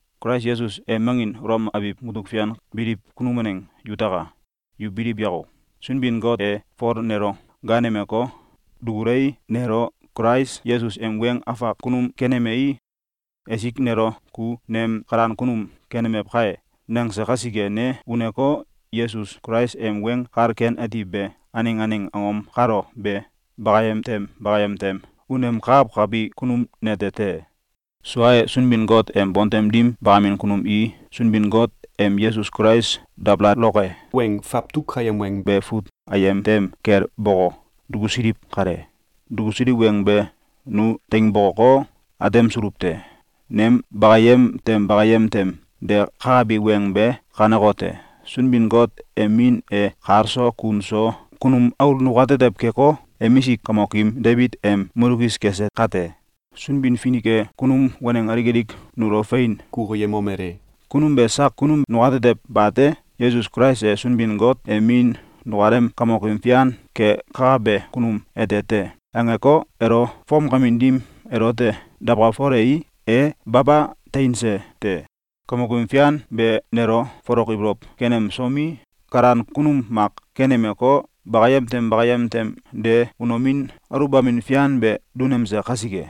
Kulais Yesus em angin Ulom abiw mutuk fian biliw kunum waneng yutaka! Yu biliw yako! Sunbin-Got e Fol nelo gaanemeko, dukulei, nelo Kulais Yesus em weng afak kunum kenemei, esik nelo ‘Ku nem kalan kunum kenemew kai!’, nangse kasike, ne uneko, Yesus Kulais em Weng Kal Ken Ati be aneng aneng angom kalo be bakayem tem bakayem tem unemkakawkabi kunum nete te. Sua e, Sunbin-Got em bontem dim bakamin kunum i Sunbin-Got em Yesus Kulais dabalaloke weng fawtuk ayem weng be fut ayem tem kel boko, dukusiliw kale. Dukusiliw weng be nu teing bokoko, atemsuluw te. Nem bakayem tem bakayem tem de kakabi weng be kanekote: Sunbin-Got em Min e kal so kun so kunum aul nukatetew keko, emisik kamokim Debit em mulkis kese kate, Sunbin-Finik e kunum waneng alik alik nulo fein kukuyemomele: “Kunum be sak kunum nukatetew bate! Yesus Kulais e Sunbin-Got em Min nukalem Kamokim Fian kekakabe kunum ete te!”, angeko, elo fomkamin dim elote dawkalfolei, e baba teinse te. Kamok Fian be, nelo folok ibolow kenemsomi, kalan kunum mak kenemeko, bakayem tem bakayem tem de unomin aluwbamin fian be dunemse kasike,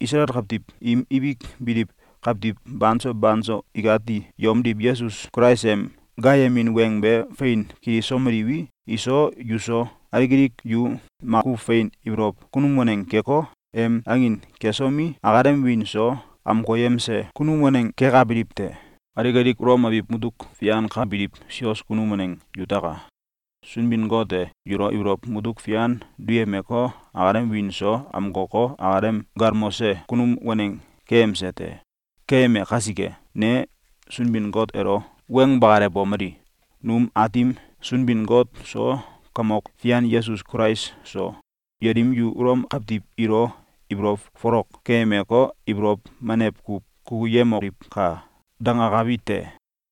Isalael kawtiw im ibik biliw kawtiw banso banso ikati yomdiw Yesus Kulais em gaayemin weng be fein kilisomeliwi, iso, yuso, alik alik yu makuw fein ibolow kunum waneng keko, em angin kesomi, akalem wiin so amkoyemse kunum waneng kekabiliw te. Alik alik Ulom abiw mutuk fian ka biliw sios kunum waneng yutaka! Sunbin-Got e yulo ibolow mutuk fian duyemeko, akalem wiin so amkoko, akalem galmose kunum waneng keyemse te. Keyeme kasike, ne Sunbin-Got elo weng bakalewomeli: “Num Aatim Sunbin-Got so, Kamok Fian Yesus Kulais so, yelim yu Ulom kawtiw ilo ibolow folok keyemeko, ibolow menew kuw kukuyemoliwka!”, dangenkabi te.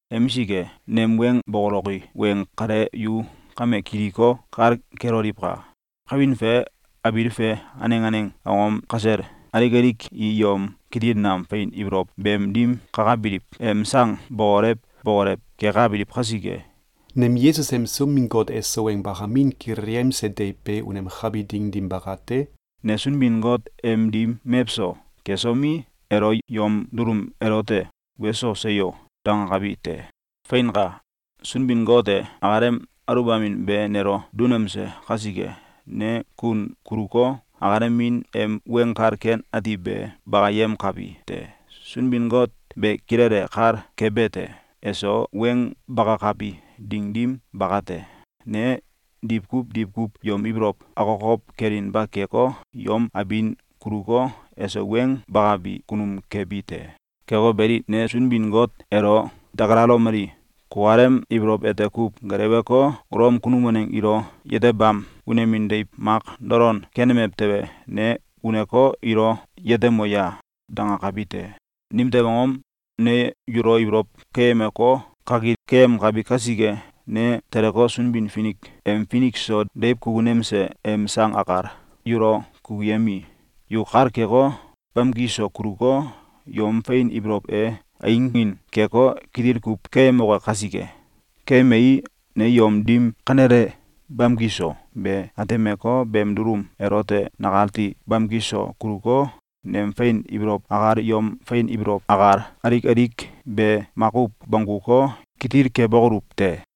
Emisik e, nem weng bokoloki weng kale yu kame kiliko, kal keloliwka! Kawin fe abiil fe aneng aneng angom kasel alik alik i yom kitil nam fein ibolow beem dim kakabiliw em sang bokolew bokolew kekabiliw kasike, nem Yesus em Sunbin-Got eso weng bakamin kilelyemse deiw be unemkabi ding dim bakate, ne Sunbin-Got em dim mewso kesomi, elo yom dulum elote “Weso! Seyo!”, dangakabi te. Feinka! Sunbin-Got e akalem aluwbamin be nelo dunemse kasike, ne kun kuluko, akalem Min em Weng Kal Ken Ati be bakayemkabi te. Sunbin-Got be kilele kal kebete: Eso weng bakakabi ding dim bakate, ne diwkuw diwkuw yom ibolow akokow kelinba keko, yom abin kuluko, eso weng bakabi kunum kebi te. Keko beli, ne Sunbin-Got elo dakalalomeli: “Kukalem ibolow ete kuw geleweko, Ulom kunum waneng ilo yetebam unomin deiw mak dolon kenemew tewe, ne uneko, ilo yetemo ya!”, dangakabi te. Nimtew angom? Ne yulo ibolow keyemeko, kakil keyemkabi kasike. Ne teleko, Sunbin-Finik em finik so deiw kukunemse em sang akal yulo kukuyemii, yu kal keko, bamki so kuluko, yom fein ibolow e einging keko, kitil kuw keyemoke kasike. Keyemei, ne yom dim kanele bamki so be atemeko, beem dulum elote nakati bamki so kuluko, nem fein ibolow akal, yom fein ibolow akal, alik alik be makuw bongguko, kitil kebokoluw te.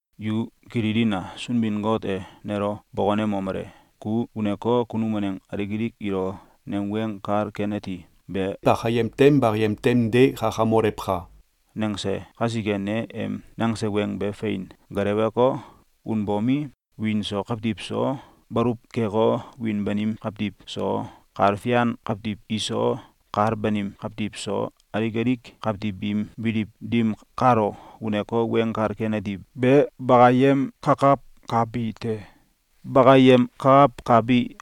Yu kililina! Sunbin-Got e nelo bokonemomele: “Ku uneko, kunum waneng alik alik ilo nem Weng Kal Ken Ati be bakayem tem bakayem tem de kakamolewka!”, nangse kasike, ne em nangse weng be fein geleweko, unbomi, wiin so kawtiw so, baluw keko, wiin banim kawtiw iso, kal fian kawtiw iso, kal banim kawtiw iso, alik alik kawtiw biim biliw dim kalo uneko, Weng Kal Ken Ati be bakayemkakawkabi te. Bakayemkakawkabi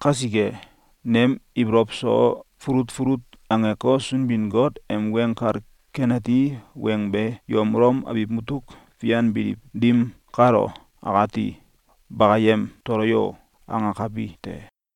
kasike, nem ibolow so fulut fulut angeko, Sunbin-Got em Weng Kal Ken Ati weng be yom Ulom abiw mutuk fian biliw dim kalo akati “Bakayem tolo yo!”, angekabi te.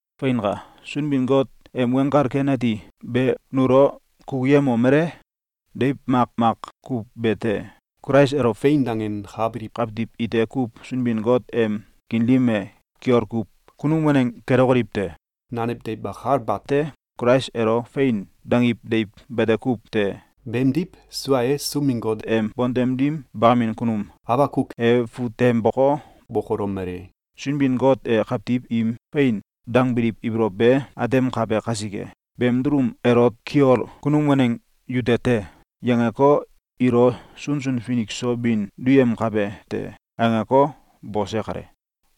Feinka! Sunbin-Got em Weng Kal Ken Ati be nulo kukuyemomele: Deiw makmak kuw be te. Kulais elo “Fein!”, dangenkabiliw kawtiw ite kuw Sunbin-Got em kiin dim e, kiol kuw kunum waneng kelokoliw te. Nanew deiw akal bate. Kulais elo “Fein!”, dangiw deiw bete kuw te. Beemdiw sua e, Sunbin-Got em bontem dim bakamin kunum Abakuk e fut tem boko, bokolomele: “Sunbin-Got e kawtiw im fein dangbiliw ibolow be atemkabe kasike, ‘Beem dulum elot kiol kunum waneng yute te!’, yangeko, ilo sunsun finik so bin duyemkabe te.”, angeko, bose kale.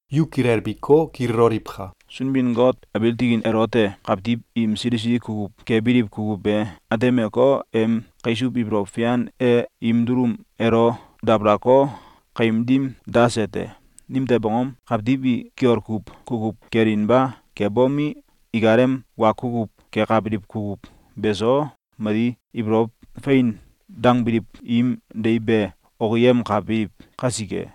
Yu kilbiko, kililoliwka! Sunbin-Got abiil tikin elote kawtiw im sili sili kukuw kebiliw kukuw be atemeko, em kaisuw ibolow fian e im dulum elo dabalako, kaim dim dase te. Nimtew angom? Kawtiw i kiol kuw kukuw kelinba kebomi, ikalem wa kukuw kekabiliw kukuw beso mali ibolow fein dangbiliw im deiw be okiyemkabiliw kasike.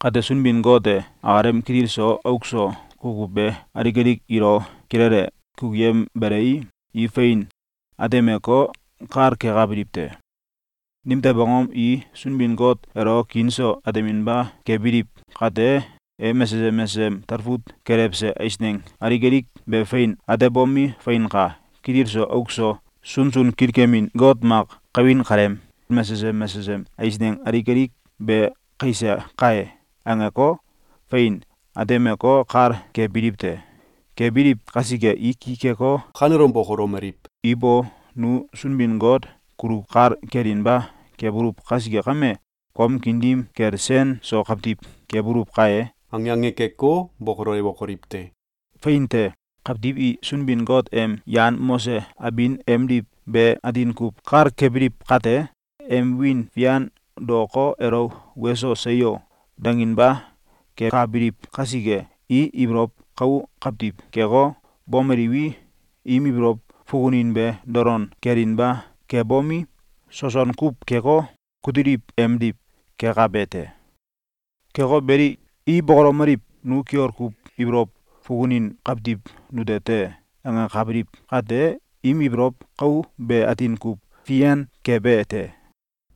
Kate, Sunbin-Got e akalem kitil so auk so kukuw be alik alik ilo kilele kukuyembelei, i fein atemeko, kal kekabiliw te. Nimtew angom? I Sunbin-Got elo kiin so ateminba kebiliw kate, em mesesem mesesem talfut kelewse eisneng alik alik be fein atebomi, “Feinka! Kitil so auk so sunsun kilkemin got mak kawin kaleem mesesem mesesem eisneng alik alik be kaise kai!”, angeko, fein atemeko, kal kebiliw te. Kebiliw kasike, i ki keko, kanelom bokolomeliw: “Ibo! Nu Sunbin-Got kulo kal kelinba kebuluw kasike kame, kom kiin dim kel sen so kawtiw kebuluw kai!”, ange ange keko, bokolewokoliw te! Fein te! Kawtiw i Sunbin-Got em yan mose abin emdiw be atin kuw kal kebiliw kate, em wiin fian daoko, elo “Weso! Seyo!”, danginba kekabiliw kasike, i ibolow kau kawtiw keko, bomeliwi, im ibolow fukunin be dolon kelinba kebomi, soson kuw keko, kutiliw emdiw kekabe te. Keko beli, i bokolomeliw: “Nu kiol kuw ibolow fukunin kawtiw nute te.”, angekabiliw kate, im ibolow kau be atin kuw fian kebe te.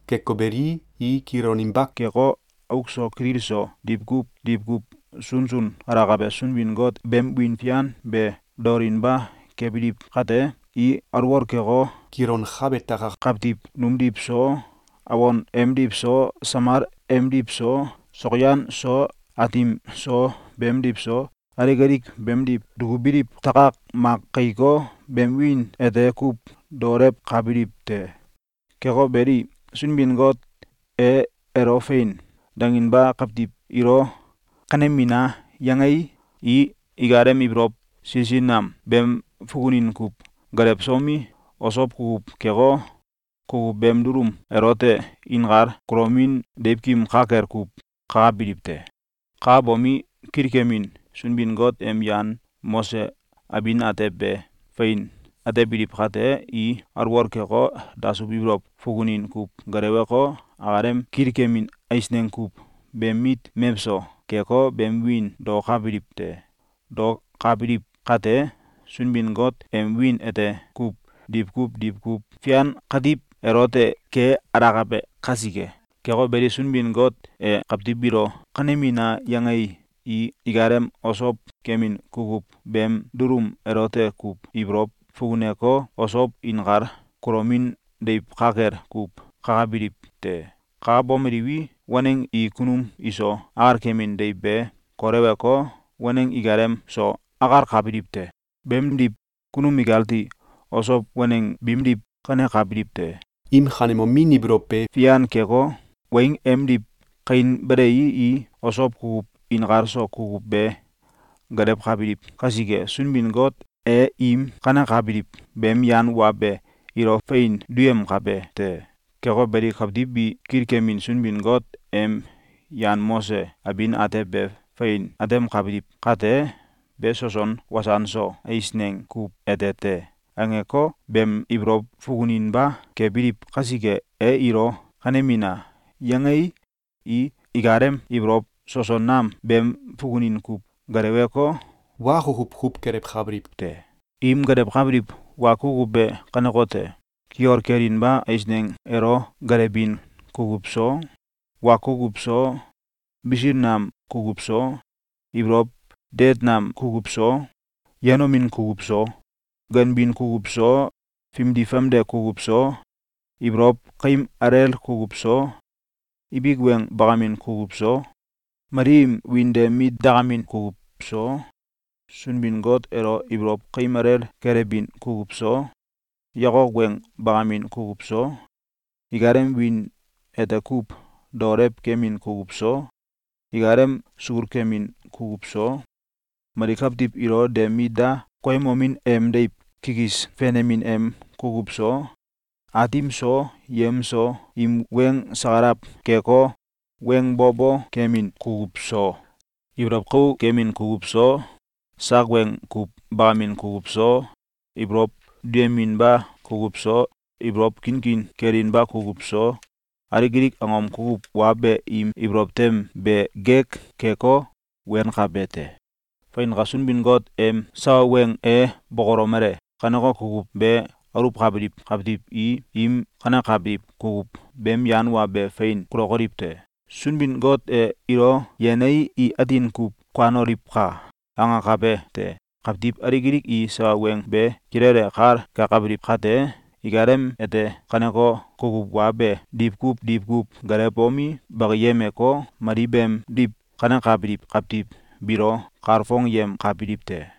Keko beli, i kiloninba keko, auk so kitil so diwkuw diwkuw sunsun alakabe Sunbin-Got beem wiin fian be daolinba kebiliw kate, i alwol keko, kilonkabe takak kawtiw numdiw so, awon emdiw so, samal emdiw so, sokyan so atim so beemdiw so, alik alik beemdiw dukubiliw takak mak kaiko, beem wiin ete kuw daolewkabiliw te. Keko beli, Sunbin-Got e elo “Fein!”, danginba kawtiw ilo “Kanemina!”, yangei, i ikalem ibolow sili sili nam beem fukunin kuw gelewsomi, osow kukuw keko, kukuw beem dulum elote inkal kulomin deiwkim ka kel kuw kakabiliw te. Kakabomi, kilkemin Sunbin-Got em yan mose abin atew be fein atebiliw kate, i alwol keko, dasuw ibolow fukunin kuw geleweko, akalem kilkemin eisneng kuw beem mit mewso keko, beem wiin daokabiliw te. Daokabiliw kate, Sunbin-Got em wiin ete kuw diwkuw diwkuw fian katiw elote ke alakabe kasike! Keko beli, Sunbin-Got e kawtiw biilo “Kanemina!”, yangei, i ikalem osow kemin kukuw beem dulum elote kuw ibolow fukuneko, osow inkal kulomin deiw ka kel kuw kakabiliw te. Kakabomeliwi, waneng i kunum iso akalkemin deiw be koleweko, waneng ikalem so akalkabiliw te. Beemdiw, kunum ikati, osow waneng biimdiw kanekabiliw te. Im kanemomin ibolow be fian keko, weing emdiw kainbelei, i osow kukuw inkal so kukuw be gelewkabiliw kasike, Sunbin-Got e im kanekabiliw beem yan wa be ilo fein duyemkabe te. Keko beli, kawtiw bi kilkemin Sunbin-Got em yan mose abin atew be fein atemkabiliw kate, “Be soson wasan so eisneng kuw ete te!”, angeko, beem ibolow fukuninba kebiliw kasike, e ilo “Kanemina!”, yangei, i ikalem ibolow soson nam beem fukunin kuw geleweko, wa kukuw kuw kelewkabiliw te. Im gelewkabiliw wa kukuw be kanekote: Kiol kelinba eisneng elo kelewbin kukuw so, wa kukuw so, bisil nam kukuw so, ibolow deet nam kukuw so, yenomin kukuw so, ganbin kukuw so, fimdi famde kukuw so, ibolow kaim alel kukuw so, ibik weng bakamin kukuw so, mali im wiin de mit dakamin kukuw so, Sunbin-Got elo ibolow kaim alel kelewbin kukuw so, yakok weng bakamin kukuw so, ikalem wiin ete kuw daolew kemin kukuw so, ikalem sul kemin kukuw so, mali kawtiw ilo de mit da koyemomin em deiw kikis fenemin em kukuw so, aatim so yem so im weng sakalaw keko, weng bo bo kemin kukuw so, ibolow kau kemin kukuw so, sak weng kuw bakamin kukuw so, ibolow duyeminba kukuw so, ibolow kinkin kelinba kukuw so, Alik alik angom kukuw wa be im ibolow tem be gek keko, wenkabe te. Feinka! Sunbin-Got em sawa weng e bokolomele: “Kaneko kukuw be aluwkabiliw kawtiw i im kanekabiliw kukuw beem yan wa be fein kulokoliw te. Sunbin-Got e ilo yenei, i atin kuw kuanoliwka!”, angakabe te. Kawtiw alik alik i sawa weng be kilele kal kekabiliw kate, ikalem ete kaneko kukuw wa be diwkuw diwkuw gelewbomi, bakiyemeko, mali beemdiw kanekabiliw kawtiw biilo kalfongyemkabiliw te.